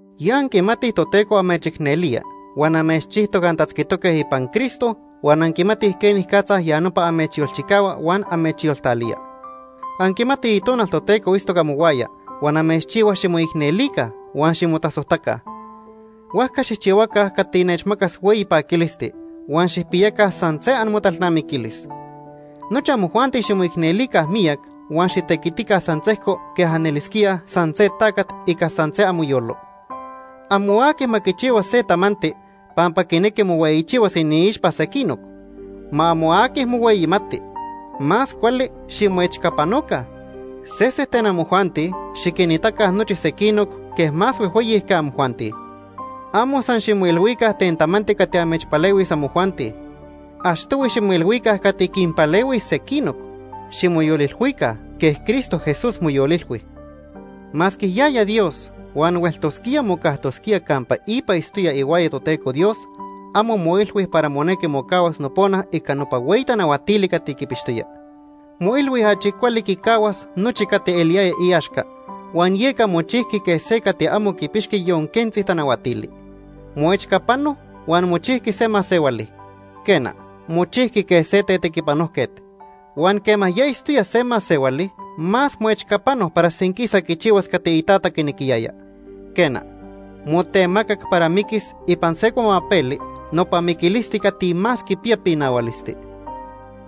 Ya anquimatij Toteco amechicnelía huan amechchijtoc antatzquitoque ipan Cristo, huan anquimatij quenicatza ya nopa amechyolchicahua huan amechyoltalía. Anquimatij Itonal Toteco itztoc amohuaya huan amechchihua ximoicnelica huan ximotasojtaca. Huajca xijchihuaca cati nechmacas hueyi paquilisti huan xijpiyaca san se amotalnamiquilis. Nochi amojuanti ximoicnelica miyac huan xitequitica san sejco quej anelisquíaj san se tacat ica san se amoyolo. Amo aqui ma quichihua se tamanti pampa quinequi mohueyichihuas iniixpa sequinoc. Ma amo aqui mohueyimati. Más cuali ximoechcapanoca. Sese ten amojuanti xiquinitaca nochi sequinoc quej más huejhueyi que amojuanti. Amo san ximoilhuica ten tamanti cati amechpalehuis amojuanti. Achtohui ximoilhuica cati quinpalehuis sequinoc. Ximoyolilhuica quej Cristo Jesús moyolilhui. Masque yaya Dios huan hueltosquía mocajtosquía campa ipa itztoya ihuaya Toteco Dios, amo moilhui para monequi mocahuas nopona ica nopa hueyi tanahuatili cati quipixtoya. Moilhui achi cuali quicahuas nochi cati eliyaya iaxca, huan yeca mochijqui quej se cati amo quipixqui yon quentzi tanahuatili. Moechcapano huan mochijqui se masehuali, quena, mochijqui quej se tetequipanojquet. Huan quema ya itztoya se masehuali, más moechcapano para senquisa quichihuas cati iTata quinequiyaya. Quena, motemacac para miquis ipan se cuamapeli, nopa miquilisti cati más quipiya pinahualisti.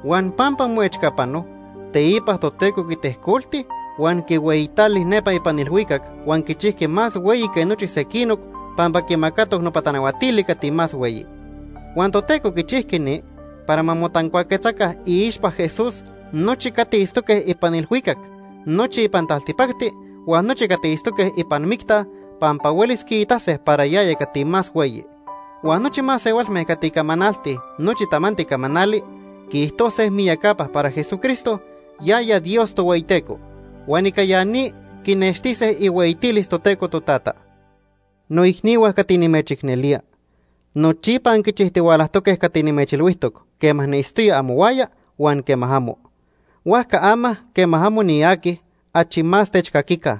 Huan pampa moechcapano, teipa Toteco quitejcolti huan quihueyitali nepa ipan ilhuicac huan quichijqui más hueyi que nochi sequinoc pampa quimacatoc nopa tanahuatili cati más hueyi. Huan Toteco quichijqui ni para ma motancuaquetzaca iixpa Jesús nochi cati itztoque ipan ilhuicac, nochi ipan taltipacti huan nochi cati itztoque ipan micta pampa huelis quiitase para yaya cati más hueyi. Huan nochi masehualme cati camanaltij nochi tamanti camanali quiijtose miyacapa para Jesucristo, yaya Dios Tohueyiteco, huan ica ya ni quinextise ihueyitilis Toteco Totata. Noicnihua cati nimechicnelía, nochipa anquichijtihualajtoque cati nimechilhuijtoc quema niitztoya amohuaya huan quema amo. Huajca ama, quema amo niaqui, achi más techcaquica.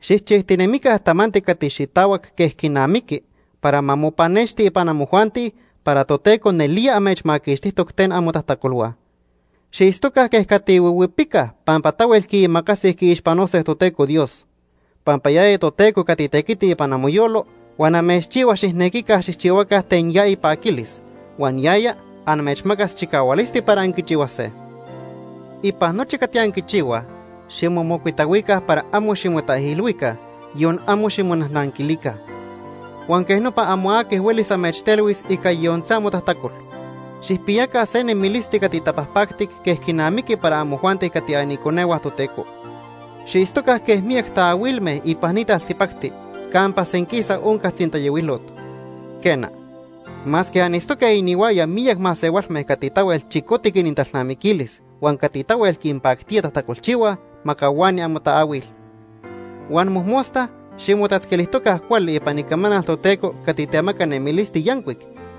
Xijchijtinemica tamanti cati xitahuac quej quinamiqui para ma mopanexti ipan amojuanti para Toteco nelía amechmaquixtijtoc ten amotajtacolhua. Xiitztoca quej cati huihuipicaj pampa tahuel quiimacasij quiixpanose Toteco Dios. Pampa yaya Toteco cati tequiti ipan amoyolo huan amechchihua xijnequica xijchihuaca ten ya ipaquilis, huan yaya amechmacas chicahualisti para anquichihuase. Ipan nochi cati anquichihuaj ximomocuitahuica para amo ximotaijilhuica, yon amo ximonajnanquilica. Huan quej nopa amo aqui huelis amechtelhuis ica yon se amotajtacol. Xijpiyaca se nemilisti cati tapajpactic quej quinamiqui para amojuanti cati aniconehua Toteco. Xiitztoca quej miyac taahuilme ipan ni taltipacti campa senquisa onca tzintayohuilot. Quena, masque anitztoque inihuaya miyac masehualme cati tahuel chicotic inintalnamiquilis huan cati tahuel quinpactía tajtacolchihuaj, ma cahuani amotaahuil. Huan mojmosta ximotatzquilijtoca cuali ipan icamanal Toteco cati temaca nemilisti yancuic,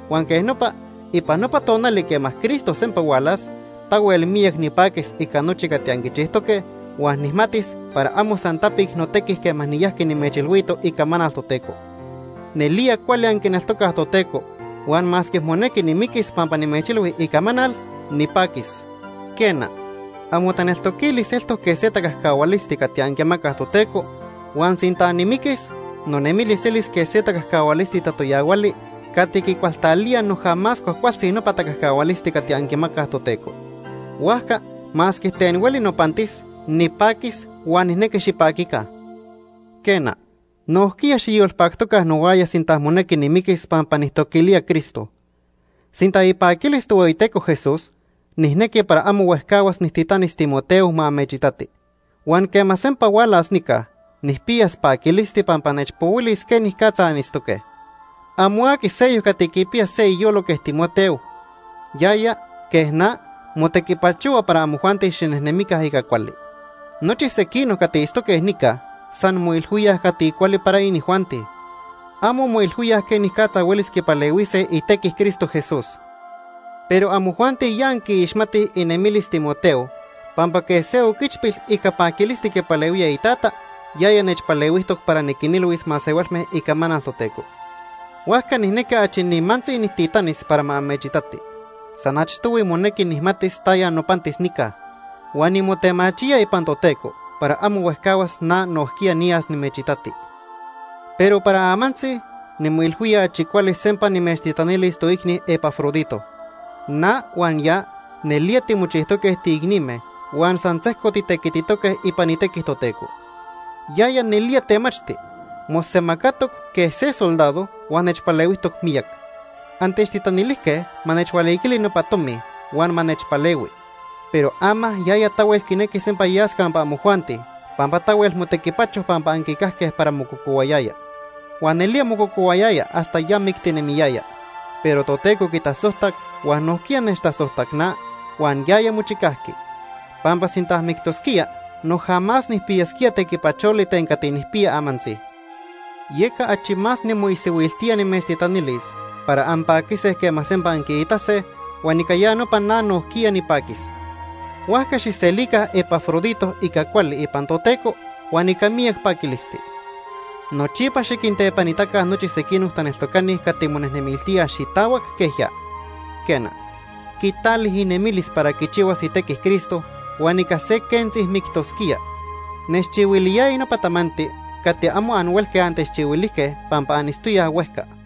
huan quej nopa ipan nopa tonali quema Cristo sempa hualas, tahuel miyac nipaquis ica nochi cati anquichijtoque, huan nijmatis para amo san tapic notequi quema niyajqui nimechilhuito icamanal Toteco. Nelía cuali anquineltocaj Toteco huan masque monequi nimiquis pampa nimechilhui icamanal, nipaquis. Quena, amotaneltoquilis eltoc quej se tacajcahualisti cati anquimacaj Toteco huan sinta nimiquis, nonemilis elis quej se tacajcahualisti tatoyahuali cati quicualtalía noja más cuajcualtzi nopa tacajcahualisti cati anquimacaj Toteco. Huajca masque ten hueli nopantis, nipaquis huan nijnequi xipaquica. Quena, nojquiya xiyolpactoca nohuaya sinta monequi nimiquis pampa nijtoquilía Cristo. Sinta ipaquilis Tohueyiteco Jesús, nijnequi para amo huejcahuas nijtitanis Timoteo ma amechitati. Huan quema sempa hualas nica, nijpiyas paquilisti pampa nechpohuilis quenicatza anitztoque. Amo aqui seyoc cati quipiya se iyolo quej Timoteo. Yaya, quej na, motequipachohua para amojuanti xinejnemica ica cuali. Nochi sequinoc cati itztoque nica san moilhuíaj cati cuali para inijuanti. Amo moilhuíaj quenicatza huelis quipalehuise itequi Cristo Jesús. Pero amojuanti ya anquiixmatij inemilis Timoteo pampa quej se oquichpil ica paquilisti quipalehuía itata, yaya nechpalehuijtoc para niquinilhuis masehualme icamanal Toteco. Huajca nijnequi achi nimantzi nijtitanis para ma amechitati. San achtohui monequi nijmatis taya nopantis nica. Huan nimotemachía ipan Toteco para amo huejcahuas na nojquiya niyas nimechitati. Pero para amantzi, nimoilhuía achi cuali sempa nimechtitanilis toicni Epafrodito. Na huan ya nelía timochijtoque tiicnime huan san sejco titequititoque ipan itequi Toteco. Yaya nelía temachti. Mosemacatoc quej se soldado huan nechpalehuijtoc miyac. Antechtitanilijque ma nechhualiquili nopa tomi huan ma nechpalehui. Pero ama yaya tahuel quinequi sempa yas campa amojuanti pampa tahuel motequipacho pampa anquicajque para mococohuayaya. Huan nelía mococohuayaya hasta ya mictinemiyaya. Pero Toteco quitasojtac huan nojquiya nechtasojtac na huan yaya mochicajqui. Pampa sinta mictosquía, noja más nijpiyasquía tequipacholi ten cati nijpiya amantzi. Yeca achi más nimoisihuiltía nimechtitanilis para anpaquise quema sempa anquiitase, huan ica ya nopa na nojquiya nipaquis. Huajca xijselica Epafrodito ica cuali ipan Toteco huan ica miyac paquilisti. Nochipa xiquintepanitaca nochi sequinoc taneltocani cati monejnemiltíaj xitahuac quej ya. Quena, quitali inemilis para quichihuas itequi Cristo huan ica se quentzi mictosquía. Nechchihuiliyaya nopa tamanti cati amo anhuelque antechchihuilijque pampa anitztoyaj huejca.